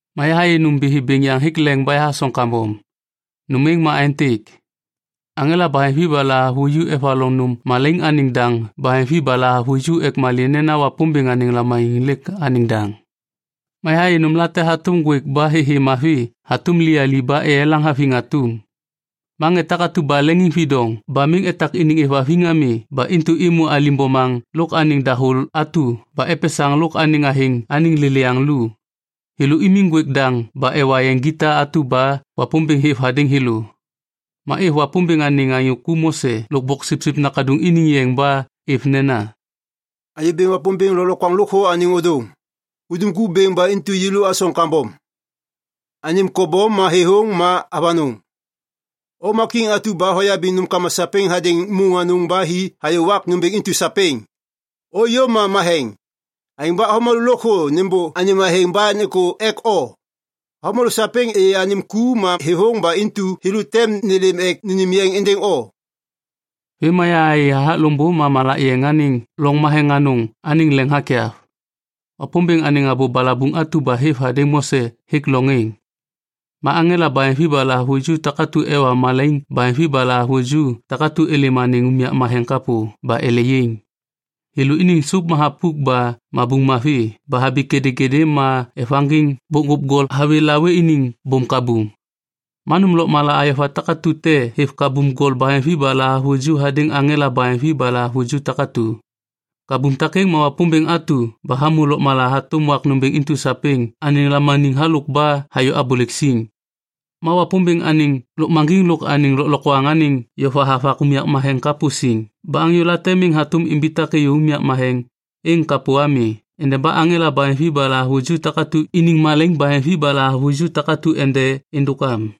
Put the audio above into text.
Ma yahayê nômbithi bêŋ yaŋ hêk leŋ ba yahasoŋ kambom. Nôm êŋ ma aêntêk: aŋela baheŋvi ba lahavuju evaloŋ nôm malaiŋ anêŋ daŋ baheŋvi ba lahavuju ek malê nena Wapômbêŋ anêŋ lamaniŋ lêk anêŋ daŋ. Ma yahayê nômlate hatôm ŋgwêk ba thêthê mavi hatôm liyali ba eyelaŋ haviŋ atum. Ma ŋê takatu ba leŋiŋvidoŋ ba miŋ etak iniŋ êvhaviŋ ami ba intu êmô alim bomaŋ lôk anêŋ dahô atu ba epesaŋ lôk anêŋ athêŋ anêŋ lêlêyaŋ lu, thêlô imiŋ ŋgwêk daŋ ba ewa yeŋ gita atu ba Wapômbêŋ hêv hadêŋ thêlô. Ma êv Wapômbêŋ anêŋ anyô ku Mose lôk Boksipsip Nakaduŋ iniŋ yeŋ ba êv nena, “Anyô Bêŋ Wapômbêŋ Lôklokwaŋ Lôkthô anêŋ Ôdôŋ, hudum ku bêŋ ba intu yêlô asoŋ kambom. Anêm kobom ma thêthôŋ ma avanôŋ. O ma kiŋ atu ba hoyabiŋ nômkama sapêŋ hadêŋ môŋ anôŋ ba hi hayô wak nômbêŋ intu sapêŋ. O iyom ma matheŋ, aêŋ ba avômalô lôkthô nêmbô anêm athêŋ ba nêkô ek o. Avômalô sapêŋ êyê anêm ku ma thêthôŋ ba intu thêlô tem nêlêm ek nênêm yeŋ êndêŋ o.” Vêm ma yahayê hathak loŋbô ma malak yeŋ anêŋ loŋ matheŋ anôŋ anêŋ leŋ hakyav. Wapômbêŋ anêŋ abô balabuŋ atu ba hêv hadêŋ Mose hêk loŋ êŋ. Ma aŋela baheŋvi ba lahavuju takatu ba ewa malaiŋ baheŋvi ba lahavuju takatu êlêm anêŋ unyak matheŋ kapô ba ele yaiŋ. Thêlô iniŋ sôp ma thapuk ba mabuŋ mavi ba habi kêdêkêdê ma evaŋgiŋ bokŋgôp gol hawê lawê iniŋ bôm kabum. Ma nôm lôkmala ayova takatu te hêv kabum gol baheŋvi ba lahavuju hadêŋ aŋela baheŋvi ba lahavuju takatu. Kabum takêŋ ma Wapômbêŋ atu ba hamô lôkmala hatôm wak nômbêŋ intu sapêŋ anêŋ lamaniŋ halôk ba hayô abôlêk siŋ. Ma Wapômbêŋ anêŋ lôkmaŋgiŋ lôk anêŋ lôklokwaŋ anêŋ yova hava unyak matheŋ kapô siŋ ba anyô late miŋ hatôm imbitak êyô unyak matheŋ êŋ kapô ami endeba aŋela baheŋvi ba lahavuju takatu iniŋ malaiŋ baheŋvi ba lahavuju takatu ende êndôk am.